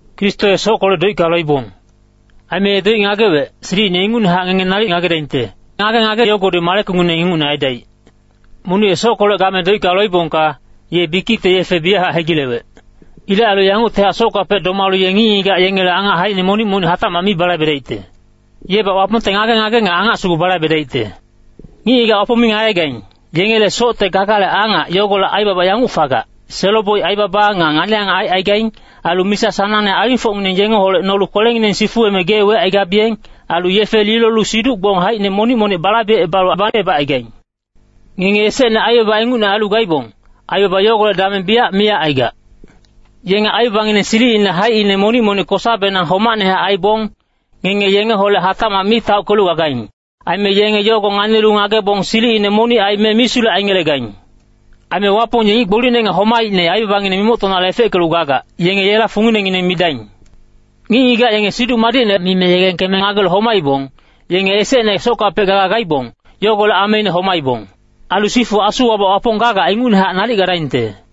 Kristo ye sockolec doicka loibong. Aime ye doic ngagewec, silicine ingucnehac ngenge nalic ngagedaingte, ngage-ngage yogodi malekungineng ingucne aidaic. Monic ye sockolec game doicka loibongka, ye bikicte yefe biyachac hegilewec. Ilec ailu yanguctihac sockapec domalu ye ngic-ngigac yengele angac haicine monic-monic hatacmac mi balaibedaicte. Yebac Wapongte ngage-ngage nga angac sugu balaibedaicte. Ngic-ngigac Wapong mi ngagegaing, yengele socte gagale angac yogolec aibaba yanguc fagac. Selo-boic aibaba nga ngani-angac aicaigaing. Ailu misa sanangne alingfocngineng yengeholec nolu kwelengineng sifuweme gee wecaigabiyeng. Ailu yefe lilolu siduc-gbong haicine monic-monic balaibecebalu alang bacebacaigaing. Ngenge esecne aibaba ingucne ailu gaibong, aibaba yogolec dameng biyac miyac aigac. Yenge aibabangineng silicine haicine monic-monic kosabenang homacnehac aibong, ngenge yengeholec hatacmac mi taockelu gagaing. Aime yenge yogo nganilu ngagebong silicine monic aime misulec aingelegaing. Aime Wapong ye ngic gbolicne nga homaicne aibabangineng mimoctonale efeckelu gagac, yenge yela funginengineng midaing. Ngic-ngigac yenge Siduc Madicne mime yegengkeme ngagelu homaibong, yenge esecne sockapec gaga gaibong, yogolec ameine homaibong. Ailu sifu asuwabac Wapong gagac ingucnehac nalic gadaingte.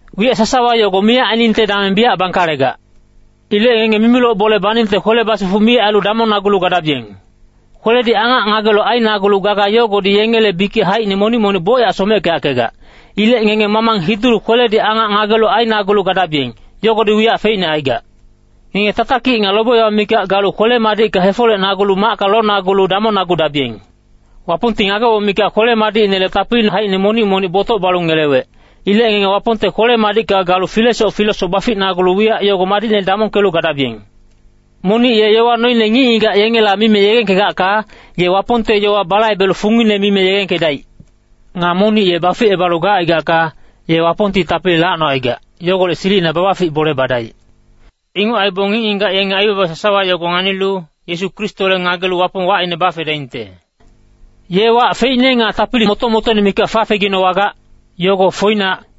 Wiyac sasawa yogo miyac ainingte dameng biyac bangkalegac. Ilec ngenge mimiloc bole baningte kwele basifuc mi ailu damongnagulu gadabiyeng. Kweledi angac ngagelu ainagulu gaga yogodi yengele bikic haicine monic-monic bocyac someckeyackegac. Ilec ngenge mamang hidulu kweledi angac ngagelu ainagulu gadabiyeng, yogodi wiyac feicne aigac. Ngenge tatakic nga lobe-yowa mikac galu kwele-madicka hefolecnagulu macka lonagulu damongnagudabiyeng. Wapongti ngageboc mikac kwele-madicinele tapili haicine monic-monic botoc balu ngelewec. Ilec ngenge Wapongte kwele-madicka galu filesoc filesoc baficnagulu wiyac yogo madicne damongkelu gadabiyeng. Monic ye yowa noine ngic-ngigac yengela mime yegengkegacka, ye Wapongte yowa balaibelu fungine mime yegengkedaic. Nga monic ye baficebalu gacaigacka, ye Wapongti tapili lacnocaigac, yogolec silicina babafic bole badaic. Inguc aibong ngic-ngigac yenge aibaba sasawa yogo nganilu, Yesu Kristole ngagelu Wapong wacine bafedaingte. Yela wac feicne nga tapili moto-motoine mikac fafeginowagac, yogo foinac.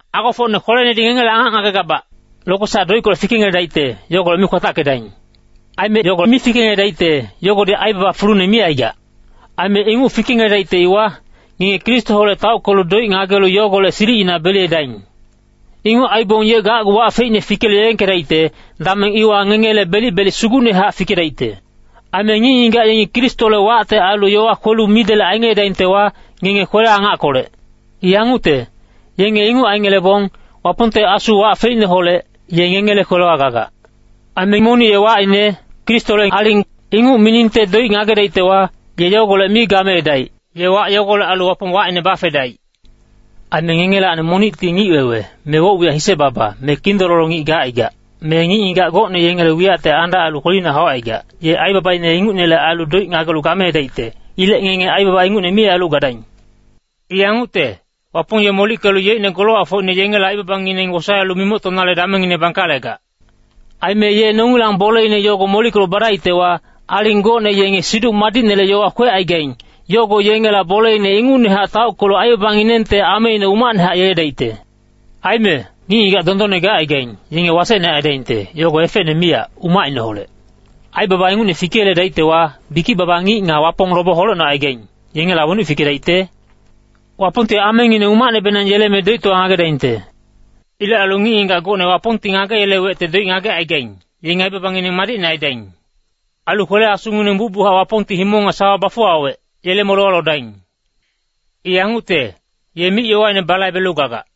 Agofocne kwelenedi ngengele angac ngagegabac, lokwesac doickolec fikengeledaicte, yogolec mi kwatackedaing. Aime yogo fikengeledaicte, yogodi aibaba fulune mi aigac. Aime inguc fikengeledaicte iwa, ngenge Kristoholec taockelu doic ngagelu yogolec silicina beliyedaing. Inguc aibong ye gacgu wac feicne fikelu yegengkedaicte, dameng iwa ngengele belic-belic sugucnehac fikedaicte. Aime ngic-ngigac yengi Kristole wacte ailu yowa kwelu midelec aingeledaingtewa, ngenge kwele-angackolec. I yangucte, yenge inguc aingelebong, Wapongte Asu wac feicneholec, ye ngengele kwelewa gagac. Aime monic ye wacine, “Kristole aling,” inguc miningte doic ngagedaictewa, ye yogolec mi gameedaic. Ye wac yogolec ailu Wapong wacine bafedaic. Aime ngengelacni monicti ngic-wewe, me woc-wiyac hise-baba, me kindololo ngic gacaigac, me ngic-ngigac gocne yengele wiyacte andac ailu kwelina haucaigac, ye aibabaine ingucnele ailu doic ngagelu gameedaicte. Ilec ngenge aibaba ingucne mi ailu gadaing. I yangucte, Wapong ye molickelu yeicne golowacfocine yengela aibabangineng wosaelu mimoctonale damengngine bangkalegac. Aime ye nongilang boleine yogo molickelu badaictewa, aling gocne yenge Siduc Madicnele yowa kwecaigaing, yogo yengela boleine ingucnehac taockelu aibabanginengte ameine umacnehac yeledaicte. Aime, “Ngic-ngigac dondonne gacaigaing, yenge wasecne aidaingte, yogo efecne miyac, umacineholec. Aibaba ingucne fikeyeledaictewa, bikic-baba ngic nga Wapong lobe holecnocaigaing, yengela wenuc fikedaicte? Wapongti amengineng umacnebenang yeleme doictowa ngagedaingte.” Ilec ailu ngic-ngigac gocne Wapongti ngageyelewecte doic ngagecaigaing, yenge aibabangineng madicne aidaing. Ailu kwele-asungineng bucbuchac Wapongti himong nga sawa bafuwawec, yele molewa lodaing. I yangucte, ye mic-yowaine balaibelu gagac.